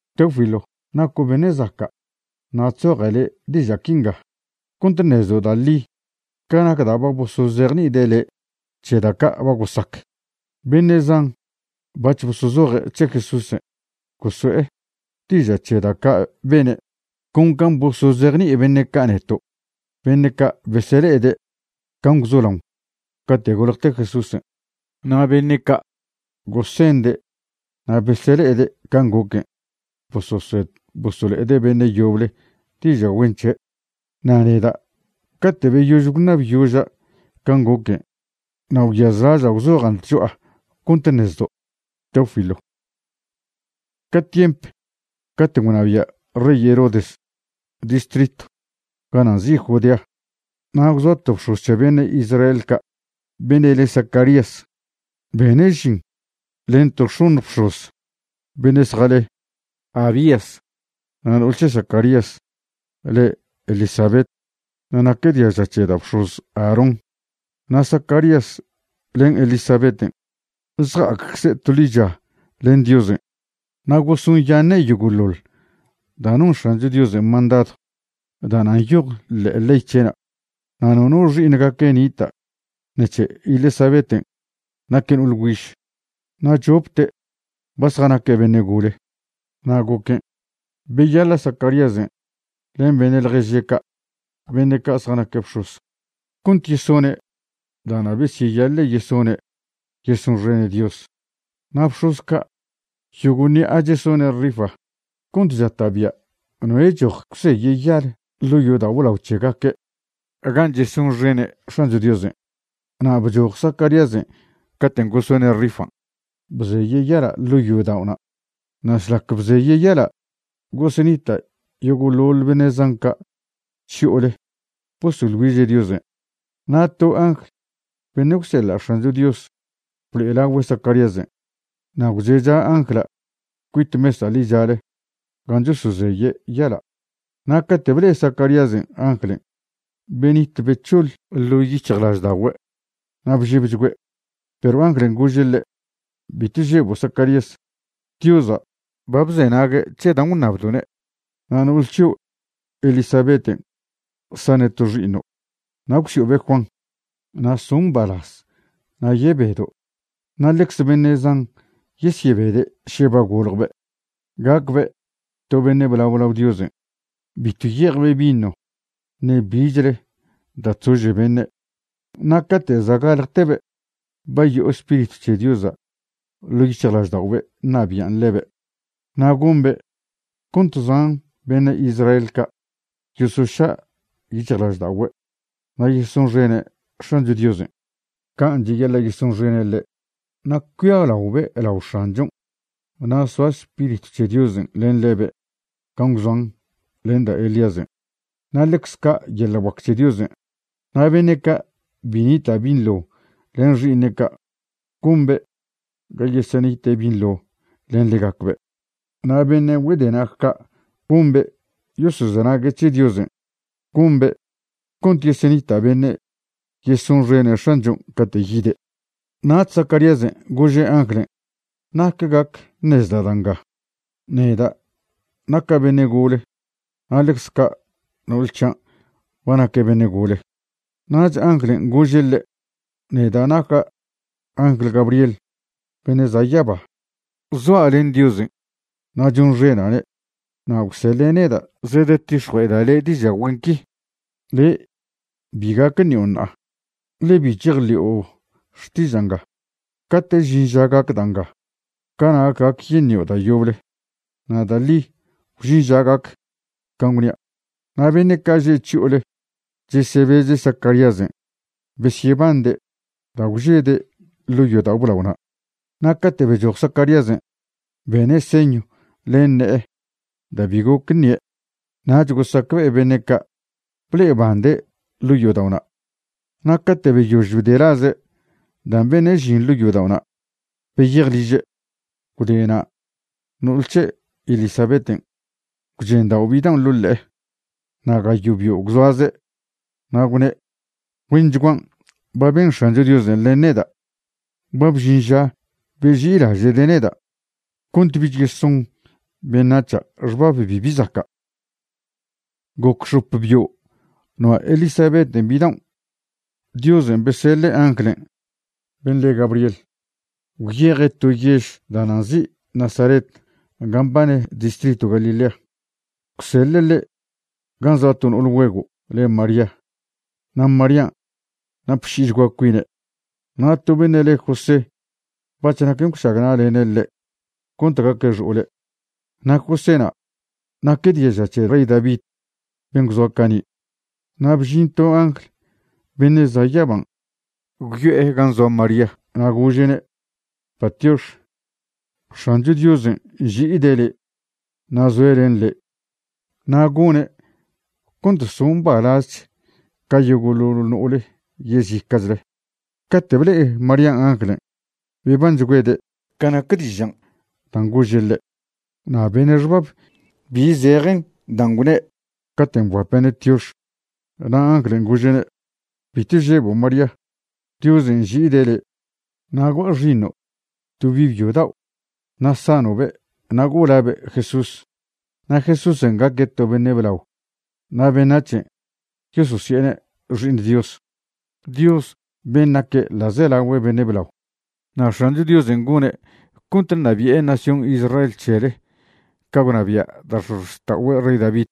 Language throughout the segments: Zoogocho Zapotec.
Teófilo, naco' beṉe' zaca' na' chzoja' le' diža' quinga cont ṉezdo' da' ḻi ca nac da' ba bosozejni'ide' le' c̱he da' ca' ba gosac. Beṉe' zan bac̱h bosozoje' c̱he Jesúsen', goso'e diža' c̱he da' ca' bene', con can' bosozejni'i beṉe' ca' neto', beṉe' ca' besele'ede' can' gwzolaon cate' goljte Jesúsen'. Na' beṉe' ca' gosende' na' besele'ede' can' goquen' bososed bosolo'ede' beṉe' yoble diža' güen c̱he'. Na' neda' cate' beyož gwṉabyoža' can' goquen' na' gwyazlaža' gwzojan' tcho'a cont ṉezdo', Teófilo. Ca tiemp caten' gwnabia' rey Herodes distritw gana' nzi' Judea, na' gwzoa to bx̱oz c̱he beṉe' Israel ca' beṉe' le Zacarías. Bene' žin len to x̱oṉj bx̱oz beṉe' zjale Abías. Na' no'ol c̱he Zacarías le Elisabet, na' naque' diaža c̱he da' bx̱oz Aarón. Na' Zacarías len Elisabeten' zja'accze' to ḻicha len Diosen' na' gosonyaṉe' yogo'ḻoḻ da' non X̱ancho Diosen' mandadw da'na' nyoj ḻe'e ley c̱he'na'. Na' nono xi'iṉgaque' nita' ṉec̱he Elisabeten' naque' no'ol güiž. Na' chopte' ba zjanaque' beṉe' gole. Na' goquen' beyaḻa' Zacaríasen' len beṉe' ḻježe' ca' beṉe' ca' zjanaque' bx̱oz cont yesone' da'na' besyeyaḻe' yesone' yesonxene' Dios. Na' bx̱oz ca' yogo' ṉi'a chesone' rifa cont chata'bia' noe' choj gwzeye' yal ḻo' yodao' blao c̱hegaque' gan' chesonxene' X̱ancho Diosen'. Na' bchoj Zacaríasen' caten' gosone' rifan' bzeye' yala' ḻo' yodao'na'. Na' šlac bzeye' yala' gosenita' yogo'ḻoḻ beṉe' zan ca' chyo'ole bosoḻ güiže' Diosen'. Na' to angl beṉe' gwseḻa' X̱ancho Dios blo'elagüe' Zacaríasen', na' gwzecha angla' cuit mesa' ḻichale gan' chosozeye' yala'. Na' cate' ble'e Zacaríasen' anglen', benit bec̱hoḻ ḻo' yic̱hjlažda'ogüe' na' bžebchgüe'. Perw anglen' gože' ḻe': ―Bitw žebo' Zacarías. Diosa' ba bzenague' c̱he dan' gwṉabdo'ne', na' no'ol c̱hio' Elisabeten' sane' to xi'iṉo', na' gwsi'obe' Juan. Na' so' mbalaz na' yebedo' na' ḻecze beṉe' zan yesyebede' še ba goljbe'. Gacbe' to beṉe' blao lao Diosen'. Bitw ye'ejbe' vino ṉe bichle da' chzože beṉe'. Na' cate' za' galjtebe' ba yo'o Spiritw c̱he Diosa' ḻo' yic̱hjlažda'obe' ṉabi'an ḻebe'. Na' gombe' cont zan beṉe' Israel ca' yosoša' yic̱hjlažda'ogüe' na' yesonxene' X̱ancho Diosen' can' cheyaḻa' yesonxene' ḻe'. Na' cuialaobe' lao X̱anchon', na' soa Spiritw c̱he Diosen' len ḻebe' can' gwzoan len da' Elíasen', na' ḻecz ca' yeḻa' guac c̱he Diosen'. Na' beṉe' ca' bi nita' binḻo len xi'iṉe' ca', gombe' ga yesenite' binḻo len ḻegacbe', na' beṉe' güedenag ca' gombe' yosozenague' c̱he Diosen'. Gombe' cont yesenita' beṉe' yesonxene' X̱anchon' cate' yide'. Nach Zacaríasen' gože' anglen': ―¿Nac gac ṉezda' da' nga? Neda' naca' beṉe' gole na' ḻecz ca' no'ol c̱hian' ba naque' beṉe' gole. Nach anglen' gože' ḻe': ―Neda' naca' angl Gabriel beṉe' za' yaba. Zoa' len Diosen' na' chonxena'ne', na' gwseḻe' neda' zedetix̱jue'eda' le' diža' güen qui. Le' bi gac ṉio' ṉa'a, ḻe bi chejḻi'o xtiža' nga. Cate' žin ža gac da' nga, cana' gac yeṉio' da' yoble. Na' da' ḻi gwžin ža gac can' gwnia'. Na' beṉe' ca' že' chyo'ole chesebeze' Zacaríasen' besyebande' da' gwžede' ḻo' yodao' blaona'. Na' cate' bechoj Zacaríasen', bene' señw len ne'e da' bi goc ṉie'. Nach gosacbe'e beṉe' ca' ble'ebande' ḻo' yodao'na'. Na' cate' beyož bdelaze' dan' bene' žin ḻo' yodao'na', beyej liže'. Gwde na' no'ol c̱he' Elisabeten' gwchendao' bidaon' ḻo' ḻe'e. Na' gayo' bio' gwzoaze'. Na' gwne': ―Güenchguan' ba ben X̱ancho Diosen' len neda'. Ba bžin ža beži'ilaže'de' neda', cont bich yeson beṉac̱ha' xbab bibi zaca'. Goc x̱op bio' noa' Elisabeten' bidaon', Diosen' beseḻe' anglen' ben' le Gabriel, gwyeje' to yež da'na' nzi' Nazaret gan' mbane distritw Galilea. Gwseḻe' ḻe' gan' zoa to no'ol güego' le' María. Na' Marían' napši'ichgua cuine'. Na' to beṉe' le' José bac̱h naquen gwšagna'lene' ḻe' cont gaque' xo'ole'. Na' Joséna' naque' diaža c̱he rey David ben' gwzoa cani'. Na' bžin to angl beṉe' za' yaban' gwyo'e gan' zoa María na' gože'ne': ―Patiox. X̱ancho Diosen' nži'ide' le' na' zoe' len le'. Na' gone' cont so' mbalazch ca yogo'ḻoḻ no'ole yezica'chle. Cate' ble'e Marían' anglen', bebanchgüede' ca nac dižan' dan' gože' ḻe'. Na' bene' xbab bi zejen dan' gwne' caten' bguape'ne' tiox. Na' anglen' gože'ne': ―Bitw žebo' María, Diosen' nži'ide' le'. Ṉa'a gua' xi'iṉo' to bi' byo dao', na' sano'be', na' go'o labe' Jesús. Na' Jesúsen' gaque' to beṉe' blao na' beṉac̱hen' yososi'ene' Xi'iṉ Dios, Dios ben' naque' ḻa'zelagüe beṉe' blao. Na' X̱ancho Diosen' gone' cont ṉabi'e nación Israel c̱hele ca gwnabia' da' x̱ozxta'ogüe' rey David.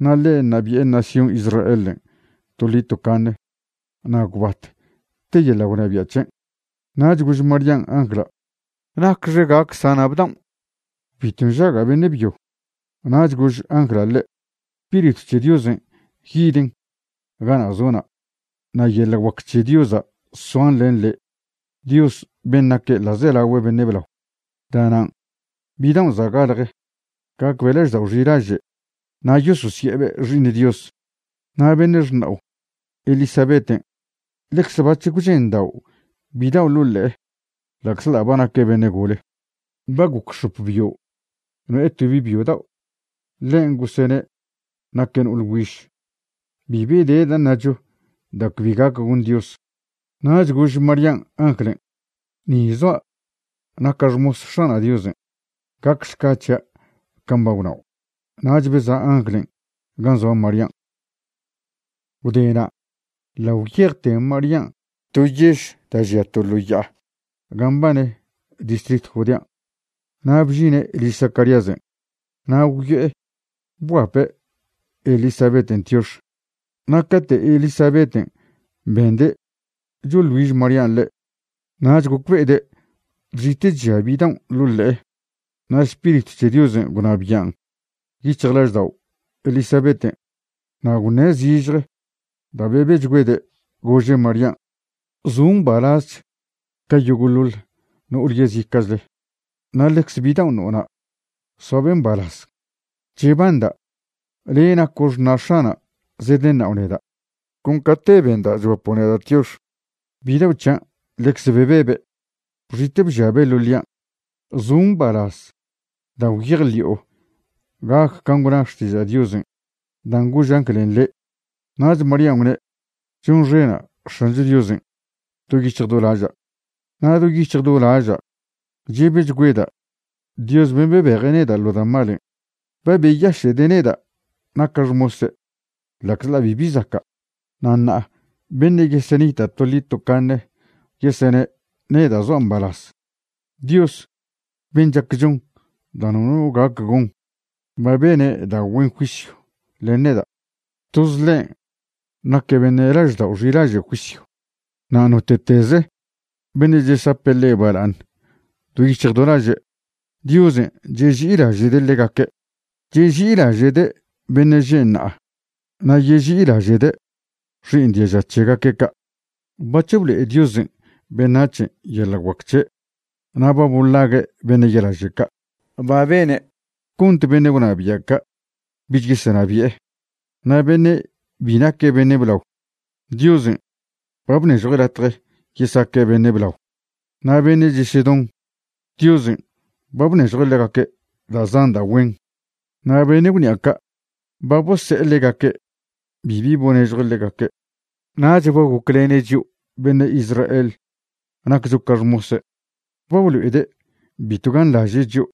Na' ḻe' ṉabi'e nación Israelen' toḻi tocaṉe, na' gwbat te yeḻa' gwnabia' c̱hen'. Nach gož Marían' angla': ―¿Nacxe gac sana' bdaon'? Bitw nžaga' beṉe' byo. Nach gož angla' ḻe': ―Spiritw c̱he Diosen' yiden gana' zo'na', na' yeḻa' guac c̱he Diosa' soan len le', Dios ben' naque' ḻa'zelagüe beṉe' blao. Da'nan' bidaon' za' galje gacbe' laždao' xilaže' na' yososi'ebe' Xi'iṉ Dios. Na' beṉe' xṉa'o Elisabeten' ḻecze bac̱h gwchendao' bidao' ḻo' ḻe'e ḻa'czḻa' ba naque' beṉe' gole. Ba goc x̱op bio' no'e to bi' byo dao', ḻen gosene' naque' no'ole güiž. Bibi de da' ṉacho da' cbi gac gon Dios. Nach gož Marían' anglen': ―Ni zoa' naca' xmos X̱ana' Diosen'. Gacšca c̱hia' con can' ba gwnao'. Nach beza' anglen' gan' zoa Marían'. Gwde na' ḻa' gwyejte Marían' to yež da' žia to ḻo ya'a gan' mbane distritw Judean', na' bžine' liž Zacaríasen'. Na' gwyo'e bguape' Elisabeten' tiox. Na' cate' Elisabeten' bende' choḻ güiž Marían' ḻe', nach gocbe'ede' chxite' chžia bidaon' ḻo' ḻe'e. Na' Spiritw c̱he Diosen' gwnabian' yic̱hjlaždao' Elisabeten' na' gwṉe' zižje da' bebechgüede', gože' Marían': ―Zo' mbalazch ca yogo'ḻoḻ no'ole yezica'chle. Na' ḻecze bidaon' no'ona' soabe' mbalaz. Chebanda' le' naco' xṉa' X̱ana' zedeṉa'o neda'. Con cate' benda' chguapo' neda' tiox, bidao' c̱hian' ḻecze bebebe', bxite' bžiabe' ḻo' ḻian'. Zo' mbalaz da' gwyejḻi'o gac can' gwna xtiža' Diosen' dan' gož anglen' le'. Nach Marían' gwne': Chonxena' X̱ancho Diosen' do yic̱hj do laža'. Na' do yic̱hj do laža' chebechgüeda' Dios ben' bebeje' neda' ḻo da' malen'. Ba beyaše'de' neda' naca' xmose' ḻa'czḻa' bibi zaca'. Na' ṉa'a beṉe' yesenita' toḻi tocaṉe yesene' neda' zoa' mbalaz. Dios ben' chac chon da' nono gac gon ba bene' da' güen juisyw len neda'. Toz ḻen' naque' beṉe' laždao' xilaže' juisyw. Na' note'teze beṉe' chesape' ḻe' bala'aṉ do yic̱hj do laže', Diosen' cheži'ilaže'de' ḻegaque'. Cheži'ilaže'de' beṉe' že' ṉa'a na' yeži'ilaže'de' xi'iṉ diaža c̱hegaque' ca'. Bac̱h blo'e Diosen' beṉac̱hen' yeḻa' guac c̱he'. Na' ba bolague' beṉe' ya'laže' ca'. Ba bene' cont beṉe' gwnabia' ca' bich yesenabi'e. Na' beṉe' bi naque' beṉe' blao, Diosen' ba bnežjue' latje yesaque' beṉe' blao. Na' beṉe' chesedon, Diosen' ba bnežjue' ḻegaque' da' zan da' güen. Na' beṉe' gwṉi'a ca', ba bose'e ḻegaque', bibi bonežjue' ḻegaque'. Nach ba goclene' chio' beṉe' Israel naccho ca xmose'. Ba blo'ede' bitw ganḻaže' chio',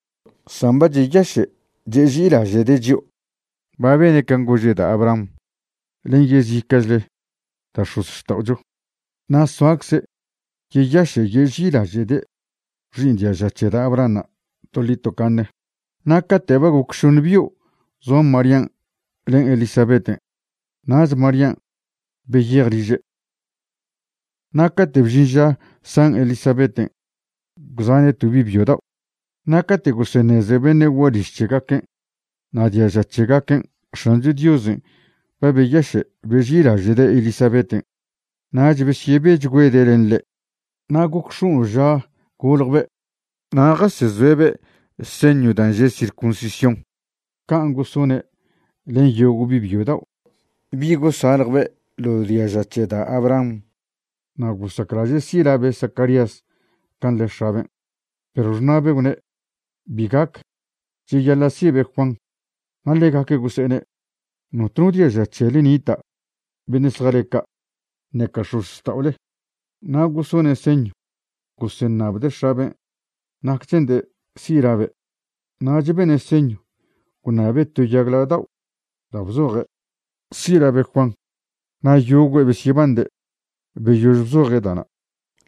san ba cheyaše' cheži'ilaže'de' chio'. Ba bene' can' gože' da' Abraham len yezica'chle da' x̱ozxta'ocho. Na' soacze' yeyaše' yeži'ilaže'de' xi'iṉ diaža c̱he da' Abrahanṉa' toḻi tocaṉe. Na' cate' ba goc šoṉe bio' zoa Marían' len Elisabeten', nach Marían' beyej liže'. Na' cate' bžin ža san Elisabeten', gwzane' bi' byo dao'. Na' cate' goseṉeze beṉe' gualiž c̱hegaquen' na' diaža c̱hegaquen' X̱ancho Diosen' ba beyaše' beži'ilaže'de' Elisabeten', nach besyebechgüede' len ḻe'. Na' goc x̱ono' ža goljbe' na' jasezoe'be' señw dan' že' circuncisión can' gosone' len yogo' bi' byo dao' bi' gosaljbe' ḻo diaža c̱he da' Abraham. Na' gosaclaže' si' labe' Zacarías can' le x̱aben', perw xṉa'be' gwne': ―Bi gac. Cheyaḻa' si'be' Juan. Na' ḻegaque' gose'ene': ―Notno diaža c̱hele nita' beṉe' zjale ca', ṉeca x̱ozxta'ole. Na' gosone' señw goseṉabde' x̱aben' nac che'nde' si' labe'. Nach bene' señw gwṉabe' to yagla' dao' da' bzoje': “Si' labe' Juan.” Na' yogüe' besyebande'. Beyož bzoje' da'na',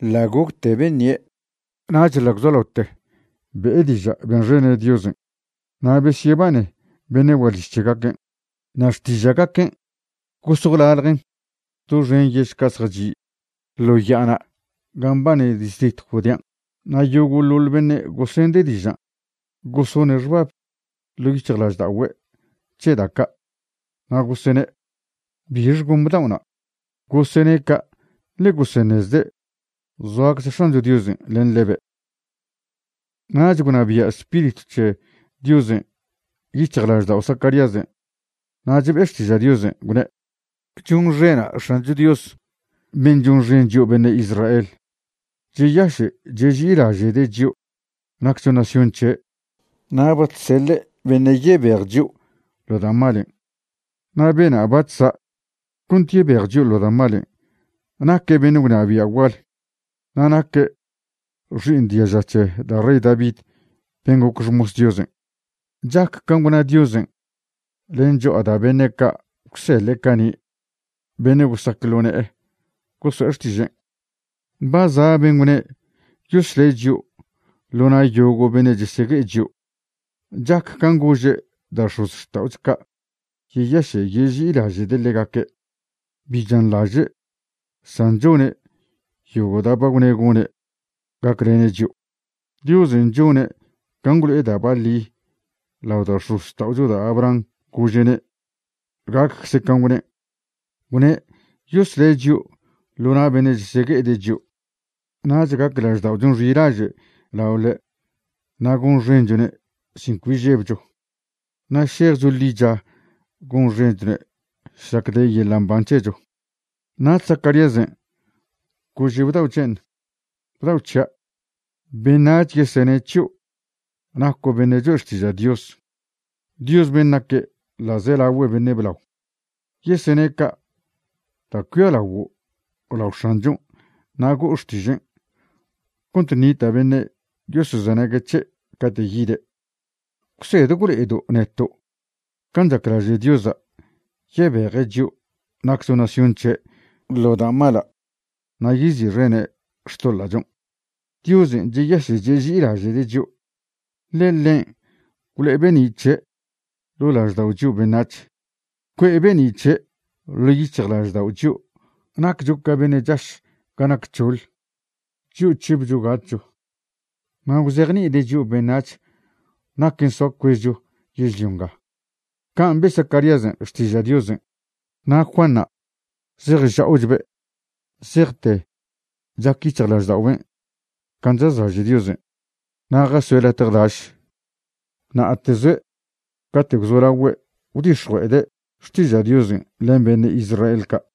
ḻa' gocte beṉie', nach ḻa' gwzolaote be'e diža' benxene' Diosen'. Na' besyebane beṉe' gualiž c̱hegaquen'. Na' xtiža'gaquen' gos gwlaljen doxen yež ca' zjachi' ḻo ya'ana' gan' mbane distritw Judean'. Na' yogo'ḻoḻ beṉe' gosende' dižan' gosone' xbab ḻo' yic̱hjlažda'ogüe' c̱he da' ca', na' gosene': ―¿Bixe gon bdao'na'? Gosene' ca' ḻe goseṉezde' zoacze X̱ancho Diosen' len ḻebe'. Nach gwnabia' Spiritw c̱he Diosen' yic̱hjlaždao' Zacaríasen', nach be'e xtiža' Diosen', gwne': Chonxena' X̱ancho Dios ben' chonxen chio' beṉe' Israel. Cheyaše' cheži'ilaže'de' chio' naccho nación c̱he' na' ba chseḻe' beṉe' yebej chio' ḻo da' malen'. Na' bena' bac̱h za' cont yebej chio' ḻo da' malen', naque' beṉe' gwnabia' gual, na' naque' xi'iṉ diaža c̱he da' rey David ben' goc xmos Diosen'. Chac can' gwna Diosen' len cho'a da' beṉe' ca' gwseḻe' cani', beṉe' gosac ḻo ne'e goso'e xtižen'. Ba za' ben' gwne' yosle' chio' ḻo na' yogo' beṉe' chesegue'e chio'. Chac can' gože' da' x̱ozxta'ocho ca' yeyaše' yeži'ilaže'de' ḻegaque'. Bi chanḻaže', san chone' yogo' da' ba gwne' gone' gaclene' chio'. Diosen' chone' can' gwlo'e da' baḻi lao da' x̱ozxta'ocho da' Abraham gože'ne' gaccze can' gwnen'. Gwne' yosle' chio' ḻo na' beṉe' chesegue'ede' chio'. Nach gac lažda'ochon' xilaže' lao ḻe' na' gonxenchone' sin cbi žebcho, na' šejcho ḻicha gonxenchone' šlac de yeḻa' mban c̱hecho. Nach Zacaríasen' gože' bdao' c̱hen': Bdao' c̱hia', beṉac̱h yesene' c̱hio' naco' beṉe' choe' xtiža' Dios, Dios ben' naque' ḻa'zelagüe beṉe' blao. Yesene' ca' da' cuialaguo' lao X̱anchon' na' go'o xtižen' cont ṉita' beṉe' yosozenague' c̱he' cate' yide'. Gwsed gwlo'edo' neto' can' chaclaže' Diosa' yebeje' chio' naccho nación c̱he' ḻo da' mala' na' yezi'xene' xtoḻa'chon'. Diosen' cheyaše' cheži'ilaže'de' chio', ḻe ḻen' gwlo'e be'ni' c̱he' ḻo' laždao' chio' beṉac̱h. Cue'e be'ni' c̱he' ḻo' yic̱hjlaždao' chio' naccho ca beṉe' chaš ga nac c̱hoḻ, chio' chžebcho gatcho. Na' gwzejni'ide' chio' beṉac̱h naquen' soa cuezcho yežlio nga. Can' be' Zacaríasen' xtiža' Diosen'. Na' Juanṉa' zej chcha'obe' zejte chac yic̱hjlažda'oben' can' chazlaže' Diosen'. Na' jasoe' latje daš. Na'ate zoe' cate' gwzolagüe' gwdix̱jue'ede' xtiža' Diosen' len beṉe' Israel ca'.